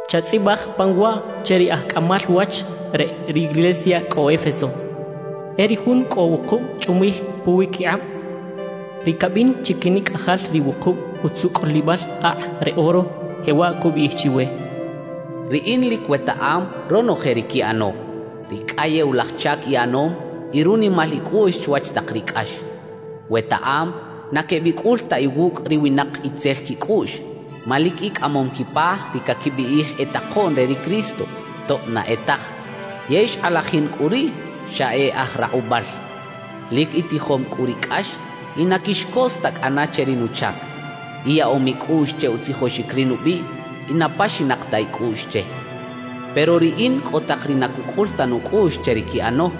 »Chatzꞌibaj pan waꞌ che ri aj cꞌamal wach re riglesia cꞌo Éfeso: E ri Jun cꞌo wukub chꞌumil puwiquikꞌab, ri cabin chiquinicꞌajal ri wukub utzucꞌulibal akꞌ re oro, jewaꞌ cubiꞌij chiwe: Riꞌin lic wetaꞌam ronoje ri quiꞌano, ri cꞌayewlaj chac iꞌanom y runimal icꞌuꞌx chwach tak ri cꞌax. Wetaꞌam na quebicꞌul ta iwucꞌ ri winak itzel quicꞌuꞌx. Ma lic icꞌamom quipa ri caquibiꞌij e takoꞌn re ri Cristo tob na e taj; yey xkꞌalajin cꞌu riꞌ xa e aj rakꞌubal. Lic itijom cꞌu ri cꞌax y na quixcos ta cꞌana che ri nuchac. Iyaꞌom icꞌuꞌx che utzijoxic ri nubiꞌ y na paxinak ta icꞌuꞌx che. Pero Riꞌin cꞌo tak ri na cucꞌul ta nucꞌuꞌx che ri quiꞌano: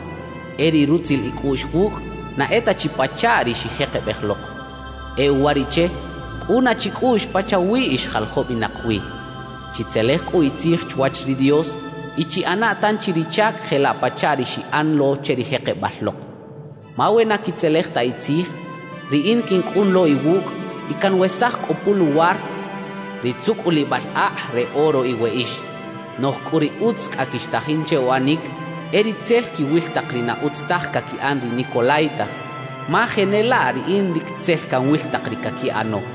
E ri rutzil icꞌuꞌx wucꞌ na e ta chi pachaꞌ ri xijekebej lok. E uwariꞌche cꞌuna chicꞌuꞌx pachawi ix jaljobinak wi. Chitzelej cꞌu itzij chwach ri Dios y chiꞌana tanchi ri chac jelaꞌ pachaꞌ ri xiꞌan lo che ri jekebal lok. Ma we na quitzelej ta itzij, Riꞌin quincꞌun lo iwucꞌ y canwesaj cꞌu puluwar ri tzucꞌulibal akꞌ re oro iweꞌix. Noꞌj cꞌu ri utz cꞌa quixtajin che uꞌanic, e ri tzel quiwil tak ri na utz taj caquiꞌan ri nicolaítas, ma jenelaꞌ Riꞌin lic tzel canwil tak ri caquiꞌano.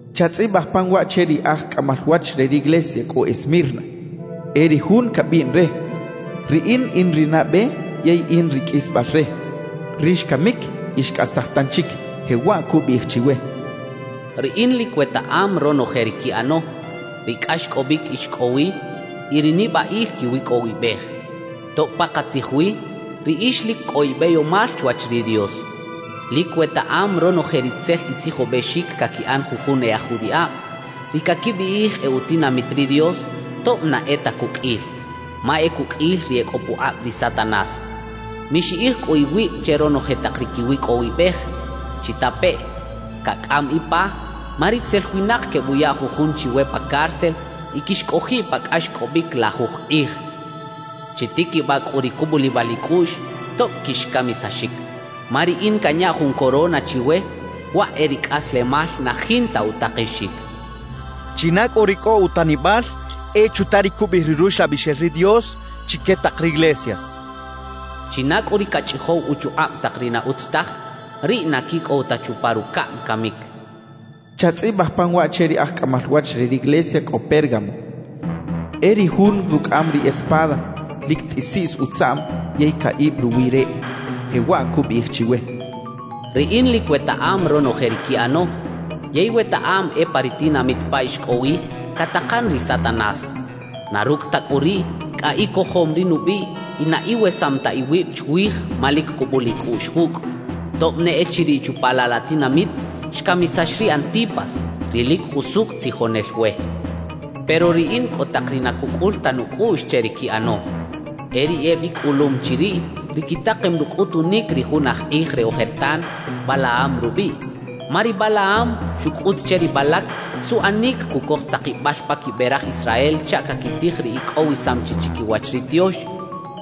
»Chatzꞌibaj pan waꞌ che ri aj cꞌamal wach re riglesia cꞌo Esmirna: E ri Jun cabiꞌn re: “Riꞌin in ri nabe yey in ri qꞌuisbal re, ri xcamic y xcꞌastaj tanchic”, jewaꞌ cubiꞌij chiwe: Riꞌin lic wetaꞌam ronoje ri quiꞌano, ri cꞌaxcꞌobic ix cꞌo wi y ri nibaꞌil quiwicꞌowibej, tob pakatzij wi riꞌix lic cꞌo ibeyomal chwach ri Dios. Lic wetaꞌam ronoje ri tzel itzijobexic caquiꞌan jujun e aj judiꞌab, ri caquibiꞌij e utinamit ri Dios tob na e ta cuqꞌuil, ma e cuqꞌuil ri e cꞌo pukꞌab ri Satanás. Mixiꞌij cꞌu iwib che ronoje tak ri quiwicꞌowibej. Chitapeꞌ: Cacꞌam ipa, ma ritzel winak quebuya jujun chiwe pa cárcel y quixcꞌojiꞌ pa cꞌaxcꞌobic lajuj kꞌij. Chitiquibaꞌ cꞌu ri cubulibal icꞌuꞌx, tob quixcamisaxic; ma Riꞌin canya jun corona chiwe, waꞌ e ri cꞌaslemal na jinta utakexic. China cꞌu ri cꞌo utanibal, e chuta ri cubiꞌij ri Ruxlabixel ri Dios chique tak riglesias. China cꞌu ri cachꞌijow uchukꞌab tak ri na utz taj, riꞌ na quicꞌow ta chupa rucaꞌm camic, cachaꞌ. »Chatzꞌibaj pan waꞌ che ri aj cꞌamal wach re riglesia cꞌo Pérgamo: E ri Jun rucꞌaꞌam ri espada lic tꞌisiꞌs utzaꞌm yey caꞌib ruwi reꞌ, jewaꞌ cubiꞌij chiwe: Riꞌin lic wetaꞌam ronoje ri quiꞌano; yey wetaꞌam e pa ri tinamit pa ix cꞌo wi, catakan ri Satanás. Na rucꞌ ta cꞌu riꞌ, cꞌa icojom ri nubiꞌ y na iwesam ta iwib chwij ma lic cubul icꞌuꞌx wucꞌ, tob ne echiriꞌ chupa laꞌ la tinamit xcamisax ri Antipas, ri lic jusucꞌ tzijonel we. Pero Riꞌin cꞌo tak ri na cucꞌul ta nucꞌuꞌx che ri quiꞌano: E ri ebicꞌulum chiriꞌ ri quitakem rucꞌutunic ri jun aj kꞌij re ojertan Balaam rubiꞌ. Ma ri Balaam xucꞌut che ri Balac suꞌanic cucoj tzakibal pa quibe raj Israel chaꞌ caquitij ri icꞌowisam chi chiquiwach ri tiox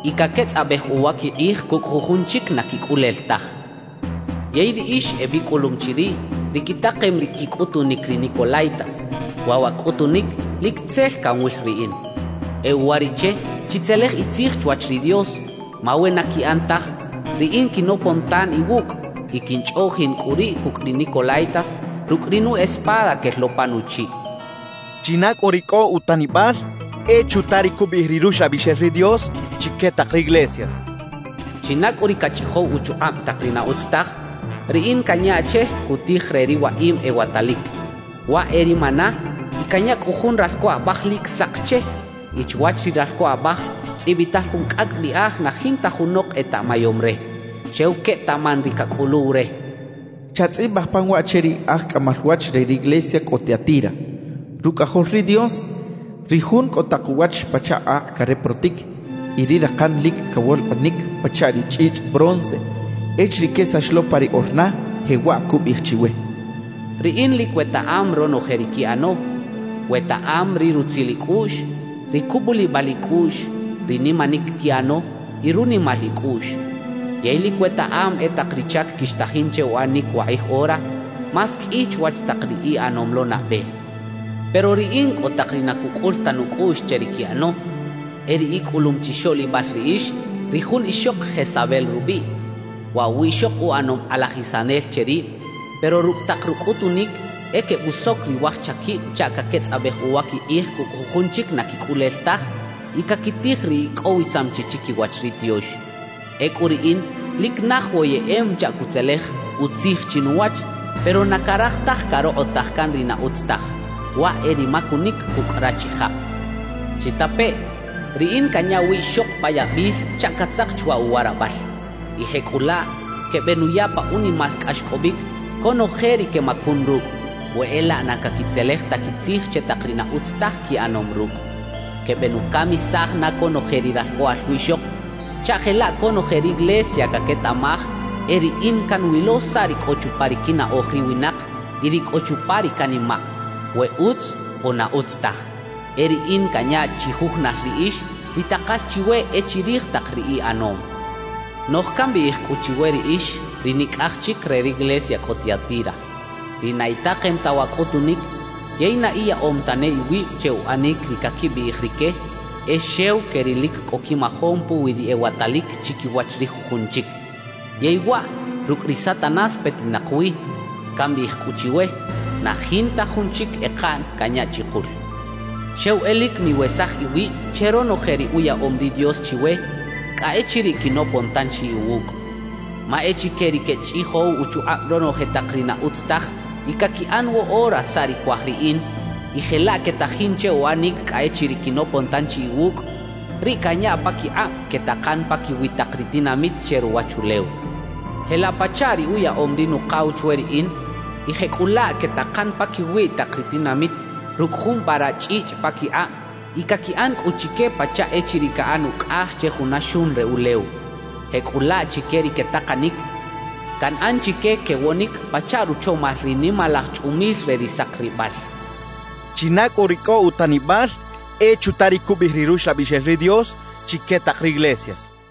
y caquetzꞌabej uwa quikꞌij cucꞌ jujun chic na quicꞌulel taj. Yey riꞌix ebicꞌulum chiriꞌ ri quitakem ri quicꞌutunic ri nicolaítas, waꞌ wa cꞌutunic lic tzel canwil Riꞌin. E uwariꞌche chitzelej itzij chwach ri Dios; ma we na quiꞌan taj, Riꞌin quinopon tan iwucꞌ y quinchꞌoꞌjin cꞌu riꞌ cucꞌ ri nicolaítas rucꞌ ri nu espada quel lo pa nuchiꞌ. China cꞌu ri cꞌo utanibal, e chuta ri cubiꞌij ri Ruxlabixel ri Dios chique tak riglesias. China cꞌu ri cachꞌijow uchukꞌab tak ri na utz taj, Riꞌin canya che cutij re ri waꞌim ewatalic, waꞌ e ri maná y canya cꞌu jun ralco abaj lic sak che y chwach ri ralco abaj tzꞌibital jun cꞌacꞌ biꞌaj na jinta junok etaꞌmayom re, xew quetaꞌman ri cacꞌuluw re, cachaꞌ. »Chatzꞌibaj pan waꞌ che ri aj cꞌamal wach re riglesia cꞌo Tiatira: Rucꞌajol ri Dios, ri Jun cꞌo tak uwach pachaꞌ akꞌ careprotic y ri rakan lic cawolkꞌinic pachaꞌ ri chꞌichꞌ bronce echiriꞌ quesax lo pa ri orna, jewaꞌ cubiꞌij chiwe: Riꞌin lic wetaꞌam ronoje ri quiꞌano. Wetaꞌam ri rutzil icꞌuꞌx, ri cubulibal icꞌuꞌx, ri nimanic quiꞌano y runimal icꞌuꞌx. Yey lic wetaꞌam e tak ri chac quixtajin che uꞌanic wakꞌij ora, más qꞌui chwach tak ri iꞌanom lo nabe. Pero Riꞌin cꞌo tak ri na cucꞌul ta nucꞌuꞌx che ri quiꞌano: E ri icꞌulum chixoꞌlibal riꞌix ri jun ixok Jezabel rubiꞌ. Waꞌ wiꞌxok uꞌanom kꞌalajisanel che rib; pero rucꞌ tak rucꞌutunic, e quebusoc ri waj chaquib chaꞌ caquetzꞌabej uwa quikꞌij cucꞌ jujun chic na quicꞌulel taj y caquitij ri icꞌowisam chi chiquiwach ri tiox. Ecꞌu Riꞌin lic naj woyeꞌem chaꞌ cutzelej utzij chinuwach, pero na caraj taj carokꞌotaj can ri na utz taj, waꞌ e ri macunic cucꞌ rachijab. Chitapeꞌ: Riꞌin canya wiꞌxok pa yabil chaꞌ catzak chwa uwarabal, y jecꞌulaꞌ quebenuya pa unimal cꞌaxcꞌobic conoje ri quemacun rucꞌ we e laꞌ na caquitzelej ta quitzij che tak ri na utz taj quiꞌanom rucꞌ. Quebenucamisaj na conoje ri ralcꞌoꞌal wiꞌxok, chaꞌ jelaꞌ conoje riglesia caquetaꞌmaj e Riꞌin canwilo saꞌ ri cꞌo chupa ri quinaꞌoj ri winak y ri cꞌo chupa ri canimaꞌ, we utz o na utz taj. E Riꞌin canya chijujunal riꞌix ri takal chiwe e chirij tak ri iꞌanom. Noꞌj cambiꞌij cꞌu chiwe riꞌix ri nicꞌaj chic re riglesia cꞌo Tiatira, ri na itakem ta wa cꞌutunic yey na iyaꞌom tane iwib che uꞌanic ri caquibiꞌij rique “e xew que ri lic cꞌo quimajom puwi ri ewatalic chiquiwach ri jujun chic” yey waꞌ rucꞌ ri Satanás petinak wi, cambiꞌij cꞌu chiwe: Na jinta jun chic ekaꞌn canya chikul. Xew e lic miwesaj iwib che ronoje ri uyaꞌom ri Dios chiwe cꞌa echiriꞌ quinopon tanchi iwucꞌ. Ma e chique ri quechꞌijow uchukꞌab ronoje tak ri na utz taj y caquiꞌan woꞌora saꞌ ri cuaj Riꞌin y jelaꞌ quetajin che uꞌanic cꞌa echiriꞌ quinopon tanchi iwucꞌ, riꞌ canya paquikꞌab quetakan paquiwi tak ri tinamit che ruwachulew, jelaꞌ pachaꞌ ri uyaꞌom ri Nukaw chwe Riꞌin. Y jecꞌulaꞌ quetakan paquiwi tak ri tinamit rucꞌ jun vara chꞌichꞌ paquikꞌab y caquiꞌan cꞌu chique pachaꞌ echiriꞌ caꞌan ucꞌaj che juna xun re ulew. Jecꞌulaꞌ chique ri quetakanic, canꞌan chique quewonic pachaꞌ ruchomal ri nimalaj chꞌumil re ri sakribal. China cꞌu ri cꞌo utanibal, e chuta ri cubiꞌij ri Ruxlabixel ri Dios chique tak riglesias, cachaꞌ.